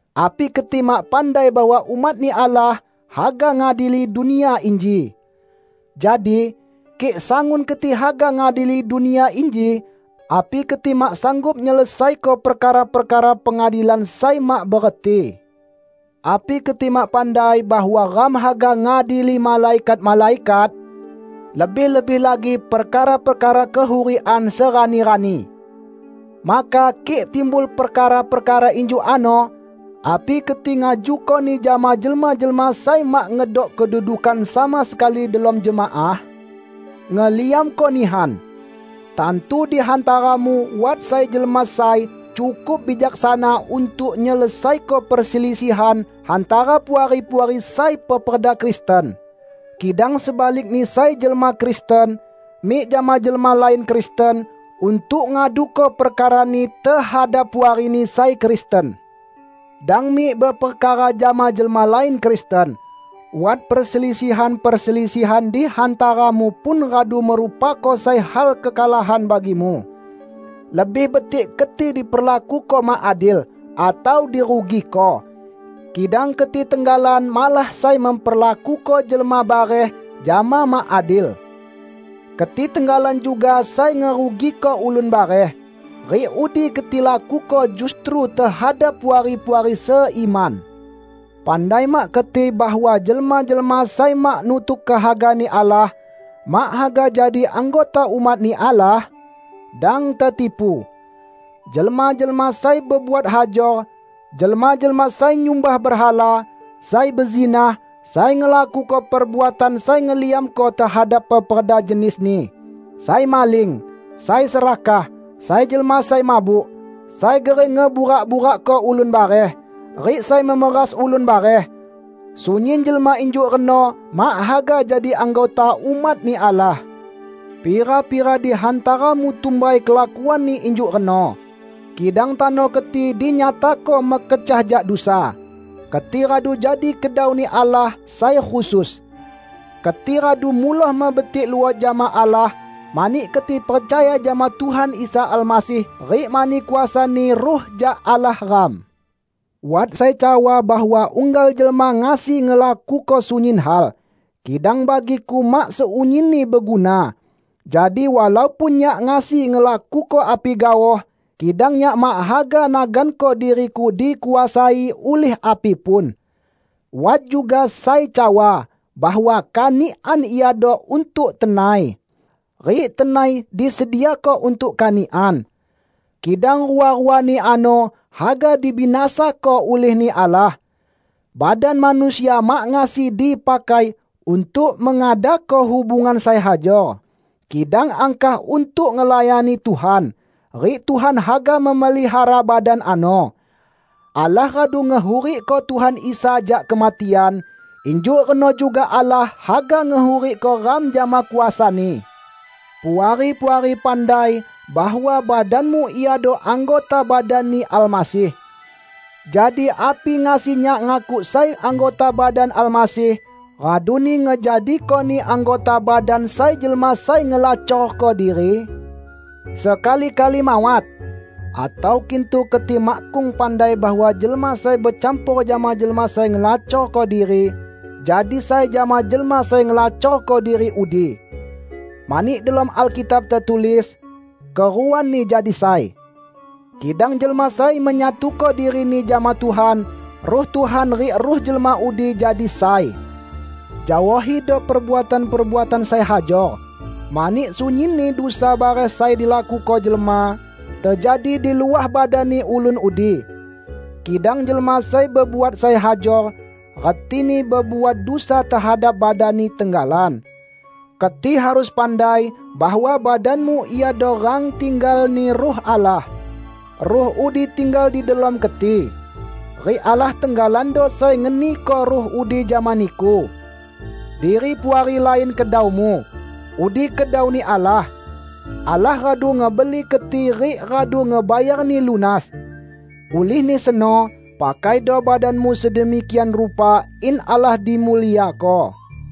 Api keti mak pandai bahwa umat-Ni Allah haga ngadili dunia inji? Jadi, kik sangun keti haga ngadili dunia inji, api keti mak sanggup nyelesaiko perkara-perkara pengadilan sai mak bereti? Api keti mak pandai bahwa ram haga ngadili malaikat-malaikat? Lebih-lebih lagi perkara-perkara kehurikan serani-rani! Maka kik timbul perkara-perkara injuk ano, api keti ngajukoni jama jelma-jelma sai mak ngedok kedudukan sama sekali delom jemaah? Ngeliamko nihan! Tantu di hantaramu wat sai jelma sai cukup bijaksana untuk nyelesaiko perselisihan hantara puari-puari sai peperda Kristen! Kidang sebalikni sai jelma Kristen mik jama jelma lain Kristen untuk ngaduko perkarani tehadap puarini sai Kristen! Dang mik beperkara jama jelma lain Kristen; wat perselisihan-perselisihan di hantaramu pun radu merupako sai hal kekalahan bagimu. Lebih betik keti diperlakuko mak adil, atau dirugiko! Kidang keti tenggalan malah sai memperlakuko jelma bareh jama mak adil. Keti tenggalan juga sai ngerugiko ulun bareh. Rik udi keti lakuko justru tehadap puari-puari seiman! Pandai mak keti bahwa jelma-jelma sai mak nutuk kehaga-Ni Allah, mak haga jadi anggota umat-Ni Allah? Dang tetipu! Jelma-jelma sai bebuat hajor, jelma-jelma sai nyumbah berhala, sai bezinah, sai ngelakuko perbuatan sai ngeliamko tehadap peperda jenisni, sai maling, sai serakah, sai jelma sai mabuk, sai gering ngeburak-burakko ulun bareh, rik sai memeras ulun bareh -- sunyin jelma injuk reno mak haga jadi anggota umat-Ni Allah. Pira-pira di hantaramu tumbai kelakuanni injuk reno. Kidang tano keti dinyatako mekecah jak dusa. Keti radu jadi kedau-Ni Allah sai khusus. Keti radu muloh mebetik luot jama Allah, mani keti percaya jama Tuhan Isa Almasih rik mani kuasa-Ni Ruh jak Allah ram. Wat sai cawa bahwa unggal jelma ngasi ngelakuko sunyin hal. Kidang bagiku mak sunyinni beguna. Jadi walaupun nyak ngasi ngelakuko api gaoh, kidang nyak mak haga naganko diriku dikuasai ulih api pun. Wat juga sai cawa bahwa kanikan iado untuk tenai, rik tenai disediako untuk kanikan. Kidang rua-ruani ano haga dibinasako ulih-Ni Allah. Badan manusia mak ngasi dipakai untuk mengadako hubungan sai hajor, kidang angkah untuk ngelayani Tuhan. Rik Tuhan haga memelihara badan ano. Allah radu ngehurikko Tuhan Isa jak kematian, injuk reno juga Allah haga ngehurikko ram jama kuasa-Ni. Puari-puari pandai bahwa badanmu iado anggota badan-Ni Almasih. Jadi api ngasi nyak ngakuk sai anggota badan Almasih raduni ngejadikoni anggota badan sai jelma sai ngelacorko diri? Sekali-kali mawat! Atau kintu keti makkung pandai bahwa jelma sai becampor jama jelma sai ngelacorko diri, jadi sai jama jelma sai ngelacorko diri udi! Mani delom Alkitab tetulis, "Keruani jadi sai." Kidang jelma sai menyatuko dirini jama Tuhan, Ruh Tuhan rik ruh jelma udi jadi sai. Jaohido perbuatan-perbuatan sai hajor. Mani sunyinni dusa bareh sai dilakuko jelma, tejadi di luah badanni ulun udi. Kidang jelma sai bebuat sai hajor, retini bebuat dusa tehadap badanni tenggalan. Keti harus pandai bahwa badanmu iado rang tinggal-Ni Ruh Allah. Ruh udi tinggal di delom keti. Rik Allah tenggalando sai ngeniko Ruh udi jama niku. Diri Puari lain kedaumu. Udi kedau-Ni Allah. Allah radu ngebeli keti rik radu ngebayarni lunas. Ulihni seno, pakaido badanmu sedemikian rupa in Allah dimuliako.